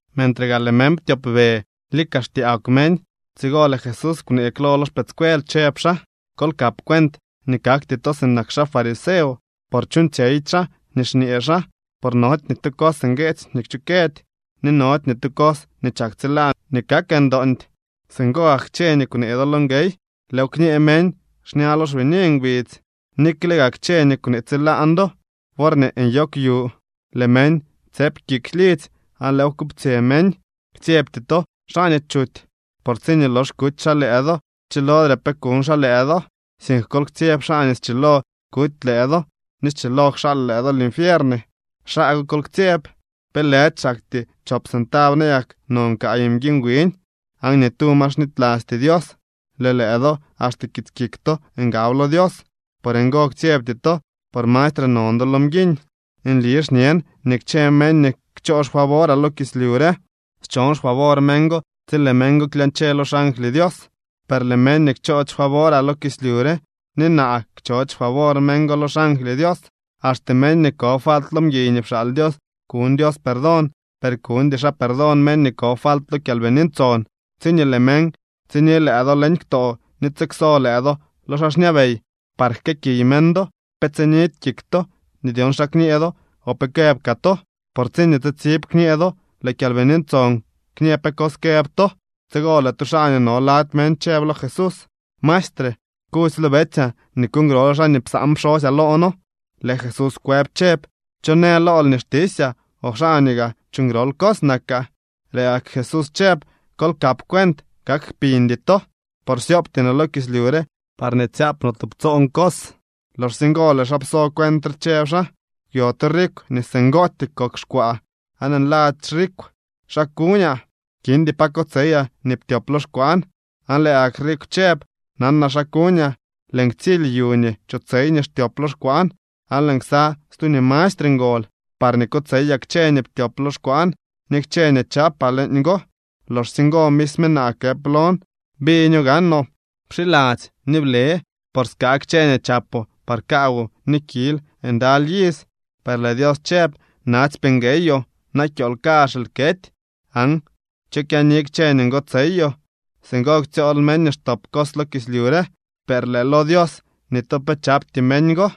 Mentre gaa lëë meñ ptyopbe, lika xtyaagw meñ. Tsigo lëë Jesús kwnee klo lo xpëëdscuel, chëb xaa: —Kol kap cuent nii kakty to sinak xaa fariseo, por chuuñtsyeydy xaa nii xñee xaa. Por nody ni tu cos ngueetsy nii kchukëdy, ni nody ni tu cos nii chak tsilaan nii kak ndoondy. Singo gak kchë nii kwnee do lo nguey, lëëw kñee meñ xña lo xbini ngbidz. Nikle gaa kchë nii kwnee tsilaan do worñee nyoogw yu, lëë meñ tsëp kik lidzy aan lëëw kuptsyë meñ. ’Ktsyebty to xaa nii chuty, por tsiñee lox kuty xaa lëë do chilodre pe kuñ xaa lëë do. Sink kol ktsyeb xaa nii schilo kuty lëë do ni schilo kxaal lëë do linfiern. Xaa go kol ktsyeb. ’¿Pe lëdy xaktyee chop centab nayak non kaay mguiñ wiñ?, aan ni tu ma xnitylasty Dios. Lëë lëë do axte kits kik to ngab lo Dios. Por ngo, ktsyebty to, por mastre non do lo mguiñ. ’Nli xñen nii kchë meñ nii kchoo xfavoraa lo kislyu re schon xfavor meñ go tsi lëë meñ go klyañche lo xangly Dios. Per lëë meñ nii kchoody xfavoraa lo kislyu re, ni naa kchoody xfavor meñ go lo xangly Dios. ’Axte meñ nii ko falt lo mguiy nii pxaal Dios kuñ Dios perdón, per kuñdy xaa perdón meñ nii ko falt lo Kyalbini Ntson. ’Tsiñee lëë meñ tsini lëë do leñ ktoo ni tsikso lëë do lo xaa xñabey par jkëëkiy meñ do, pe tsinidy kik to nii dyon xa kñee do o pe këëb kaa to. Por tsiñee tsitsib kñee do, lëë Kyalbini Ntson kñë pe cos këb to. Tsigo lëë tu xaa nii no lady meñ chëb lo Jesús: —Maestre, kudzy lo betsyaa nii kuuñ grol xaa nii psaan pxosyaa loo noo. Lëë Jesús kwëb chëb: —¿Cho në lool nii xtisyaa o xaa nii gaa chuuñ grol cos nakaa? Lëë gak Jesús chëb: —Kol kap cuent. Kak kpiñdy to, por syoobty no kislyu re parñee tsyaap no tubtsoon cos. Loxsye ngo lëë xaa pso cuent re, chëb xaa: —Kwyo tu rikw nii singootyee kok xkwaa, aan nladzy rikw: “¿Xa kuñaa? Kindy pa kotseyaa nii ptyop lo xkwaan.” Aan lëë gak rikw chëb: “Nanaa xa kuñaa. Lëën ktsily yu nii chotsey nii xtyop lo xkwaan, aan lëën ksa stu nii mastre ngol, parñee kotseyaa kchë nii ptyop lo xkwaan ni kchë nii chaapaa leeñgo. Loxsye ngo misme naa këp lon: Biño gaanoo. Pxiladzy ni ble, por skaa kchë nii chapoo par kaawoo ni kil ndaly iz.” Per lëë Dios chëb: “Natsypee ngueyoo. Na kyool kazh lëël kety. Aan ¿cho kyaani kchë nii ngotseyoo?” Singo xtsyool meñ nii xtop cos lo kislyu re, per lëë lo Dios, ni tu pe chapty meñ go.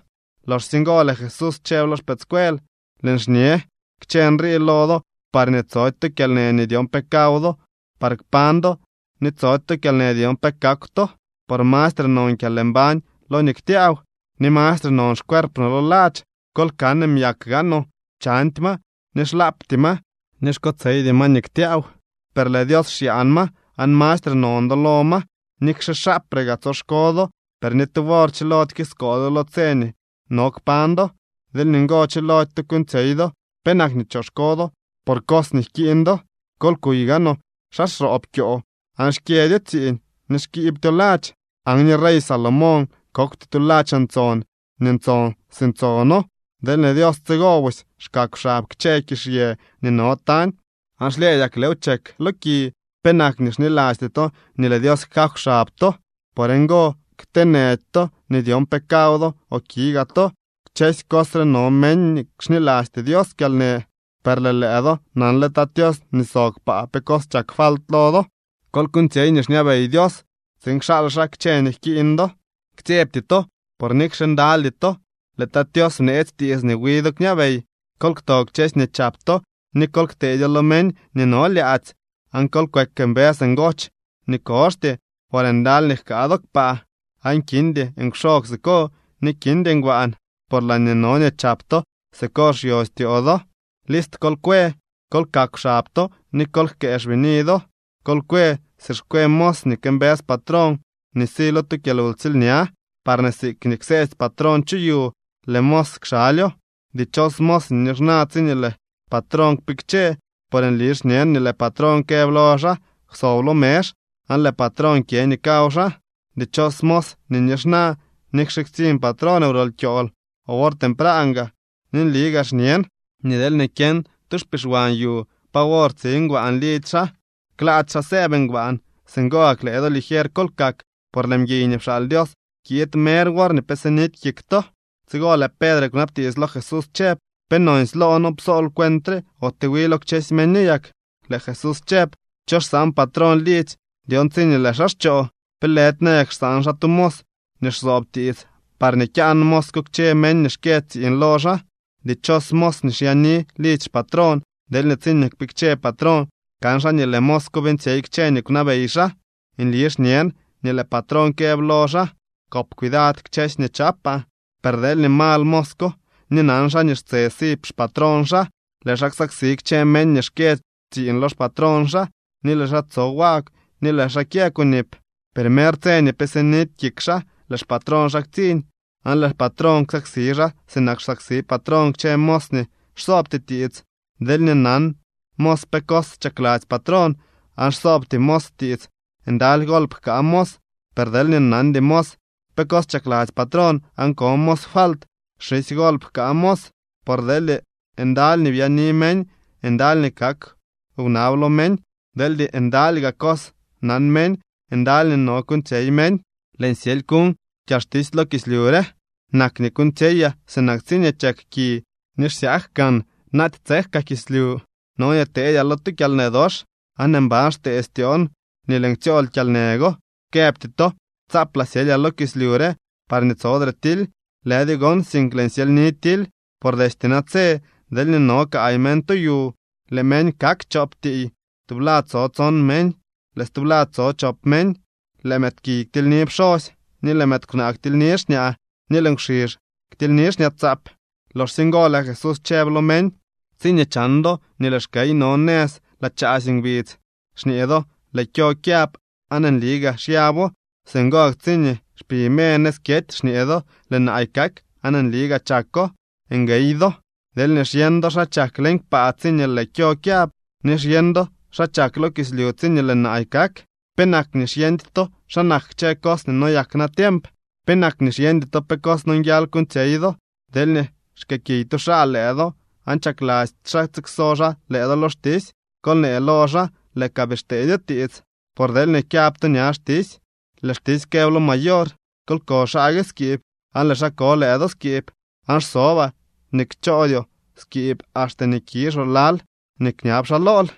Loxsye ngo lëë Jesús chëb lo xpëëdscuel: —Lëën xñe kchë nrii lo do parñee tsody to kyalnë nii dyon pe kaw do par kpañ do, ni tsody to kyalnë nii dyon pe kakw to. Por mastre non kyalmbañ lo nii ktyaaw, ni mastre non xcuerp no lo ladx. Kol kan myak gaanoo. Chandy ma, ni xlaapty ma, ni xkotseydy ma nii ktyaaw, per lëë Dios xyaan ma. Aan ¡mastre non do lo ma! Nikxe xaapre gaa tsoxko do, per ni tu wor chilody kiskool do lo tse nii no kpañ do. Deel ni ngo chilody to kuuñtsyey do, ¿penak nii choxko do por cos nii jkiiñ do? ’Kol kuy gaanoo xa xroob kyoo aan xkyëdyo tsiiñ ni xkibtyo ladx. Aan ni rey Salomón kokwty tu ladx ntson nii ntson si ntsono. Deelñee Dios tsigo busy xkakw xab kchë kizhyë nii no tañ aan xlyëdyak lëëw chek lo ki, ¿penak nii xnilasty to nii lëë Dios jkakw xab to? Por ngo, kteenëdy to nii dyon pe kaw do o ki gaa to. Kchësy cos re no meñ nii xnilasty Dios kyalnë, per lëë lëë do nanle Tat Tios nii sob kpaa pe cos chak falt lo do. Kol kuuñtsyey nii xñabey Dios tsiin kxaal xaa kchë nii jkiiñ do. ’Ktsyebty to, por nikxe ndalydy to, lëë Tat Tios bneetsy tiits nii wi do kñabey. Kol kto kchësy nii chap to, ni kol kteedyo lo meñ nii no lyaadzy, aan kol kweek mbës ngoch nii koxty, por ndaly nii jkaa do kpaa, aan kindy nkwxog siko ni kindy ngbaan. Por laañee no nii chap to siko xyo styoo do. ’List kol kwe, kol kakw xab to, ni kol jkëë xbini do. Kol kwe si xkwe mos nii këmbës patrón nii si lo tu kyalwtsiilña, parñee siikñee kseetsy patrón chu yu, lëë mos kxalyo. Dichos mos nii nixna tsiñee lëë patrón kpikche, por nli xñen nii lëë patrón këb lo xaa: “Kwsob lo mezh”, aan lëë patrón kyë nii kaw xaa. Dichos mos nii nixna nikxe ktsiñ patrón wrol kyool o wor tempran gaa. Ni nli gaa xñen nii deelñee kyeñ tu xpixwan yu pa wor tsi ngbaan lidzy xaa, klaady xaa sëëb xaa. Singo gak, lëë do, ligier kol kak, por lëë mguiy nii pxaal Dios kiid mer worñee pe sidy kik to. Tsigo lëë Pedre kwnabtiits lo Jesús chëb: —¿Pe nonsy loo noo psool cuent re ote wi lo kchësy meño yak? Lëë Jesús chëb: —¿Cho xsaan patrón lidzy dyon tsiñee lëë xaa xchoo? ¿Pe lëdy nayak xsaan xaa tu mos nii xsoob tiits parñee kyaan mos ko kchë meñ nii xkyë tsiiñ lo xaa? Dichos mos nii xyaani lidzy xpatrón deelñee tsiñee kpikche patrón, kan xaa nii lëë mos ko beeñtsyey kchë nii kwnabey xaa. Nli xñen, nii lëë patrón këb lo xaa: “Kop cuidad kchësy nii chaapaa.” Per deelñee mal mos ko ni nan xaa nii xtse si xpatrón xaa, lëë xaa ksaksi kchë meñ nii xkyë tsiiñ lo xpatrón xaa, ni lëë xaa tso wagw ni lëë xaa kyë kunip. Per mer tse nii pe sinidy kik xaa, lëë xpatrón xaa ktsiñ, aan lëë patrón ksaksi xaa sinak xsaksi patrón kchë mos nii xsoobty tiits. ’Deelñee nan mos pe cos chakladzy patrón, aan xsoobty mos tiits, ndaly golp jkaa mos. Per deelñee nandy mos pe cos chakladzy patrón aan ko mos falt, xisy golp jkaa mos. Por deelñee ndaly nii byaani meñ, ndaly nii kak wnab lo meñ. Deelñee ndaly gaa cos nan meñ, ndaly nii no kuuñtsyey meñ. ’Lëën syely kuñ kyalxtisy lo kislyu. Nak nii kuuñtsyeyaa sinak tsiñee chek ki, ni ¡xsyaak gaan naaty tsek kaa kislyu! No nii teedyaa lo tu kyalnë dox, aan ¡mban xtee styoon nii lëën ktsyool kyalnë go! Këbty to tsaaplaa syelyaa lo kislyu re parñee tsodre tily. Lëdyo gon, sink lëën syelyni tily. Por destye natse, deelñee no kaay meñ tu yu, lëë meñ kak chop tiiy. Tublad tso tson meñ, lëë stublad tso chop meñ. Lëë mëëdpkiy ktilyni pxosy, ni lëë mëëd kwnaa ktilyni xñaa, ni lëë nkwxizh ktilyni xñaatsaap. Loxsye ngo lëë Jesús chëb lo meñ: —Tsiñee chan do nii lëë xkey no nëz laa chaasy ngbidz, xñee do lëë kyo kyab, aan nli gaa xyabo. Singo gak tsiñee xpi me nëz kyety xñee do lëë naay kak, aan nli gaa chako. ¡Nguey do! Deelñee xyeñ do xa chak leñ kpaa tsiñee lëë kyo kyab, ni xyeñ do xa chak lo kislyu tsiñee lëë naay kak, ¿penak nii xyeñdy to xa nak kchë cos nii noyak natiemp? ’¿Penak nii xyeñdy to pe cos nonguial kuuñtsyey do? Deelñee xkëëkiy tu xaa lëë do aan chakladzy xaa tsikso xaa lëë do lo xtisy, kol nee lo xaa lëë ka bii xteedyo tiits. Por deelñee kyab to ña xtisy, lëë xtisy këb lo mayor: “Kol ko xaa gue skiib”, aan lëë xaa ko lëë do skiib. Aan xsobaa nii kchoodyoo skiib axte nii kizhoo lal nii kñab xaa lool.